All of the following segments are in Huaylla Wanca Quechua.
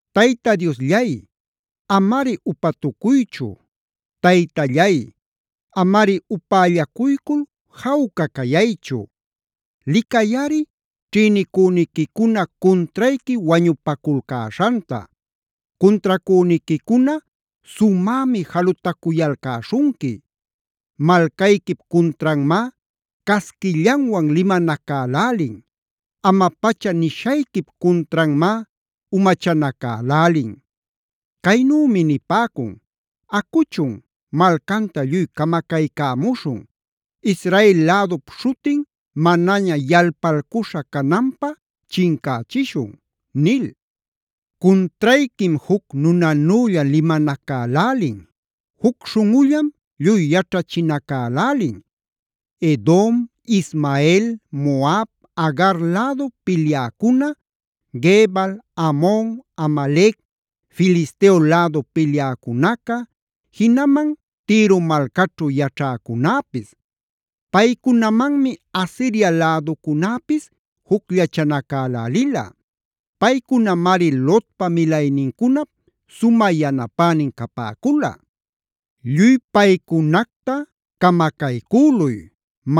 Tayta Diosllay, amari upatucuychu. Taytallay, amari upällacuycul jawca cayaychu. Licayꞌari ćhïnicüniquicuna cuntrayqui wañupaculcäśhanta. Cuntracüniquicuna sumämi jalutacuyalcäśhunqui. Malcayquip cuntranmá casquillanwan limanacälälin. Ama-pacha nishayquip cuntranmá umachanacälälin. Caynümi nipäcun: “Acuchun, malcanta lluy camacaycämuśhun. Israel lädup śhutin manaña yalpalcuśha cananpä chincächishun” nil. Cuntrayquim juc nunanülla limanacälälin. Juc śhunꞌullam lluy yaćhachinacälälin: Edom, Ismael, Moab, Agar lädu pilyäcuna, Gebal, Amon, Amalec, Filisteo lädu pilyäcunaca, jinaman Tiro malcaćhu yaćhäcunäpis. Paycunamanmi Asiria läducunäpis jucllachanacälälila. Paycunamari Lotpa milaynincunap sumä yanapänin capäcula. Lluy paycunacta camacaycüluy;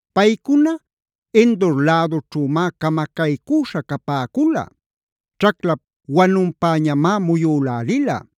Paycuna Endor lädućhümá camacaycüśha capäcula. Ćhaclap wanunpäñamá muyülälila.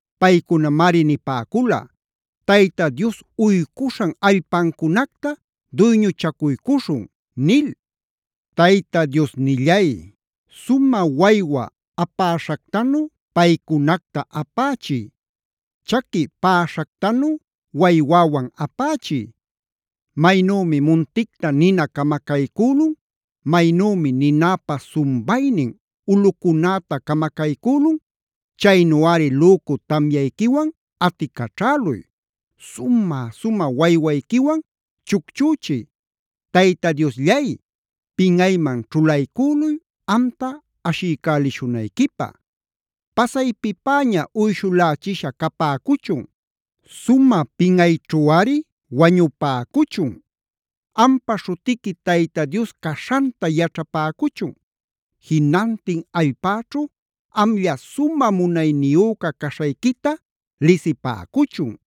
Paycunamari nipäcula: “Tayta Dios uycuśhan allpancunacta duyñuchacuycuśhun” nil. Tayta Diosnillay, sumä waywa apäśhactanu paycunacta apächiy. Chaqui päśhactanu waywäwan apächiy. Maynümi munticta nina camacaycülun, maynümi ninäpa sumbaynin ulꞌucunäta camacaycülun, chaynuꞌari lücu tamyayquiwan aticaćhäluy. Sumä-sumä waywayquiwan chucchüchiy. Tayta Diosllay, pinꞌayman ćhulaycüluy amta ashiycälishunayquipä. Pasaypipäña uyshulächisha capäcuchun. Sumä pinꞌayćhuꞌari wañupäcuchun. Ampa śhutiqui Tayta Dios caśhanta yaćhapäcuchun. Jinantin allpäćhu amlla sumä munayniyüca caśhayquita lisipäcuchun.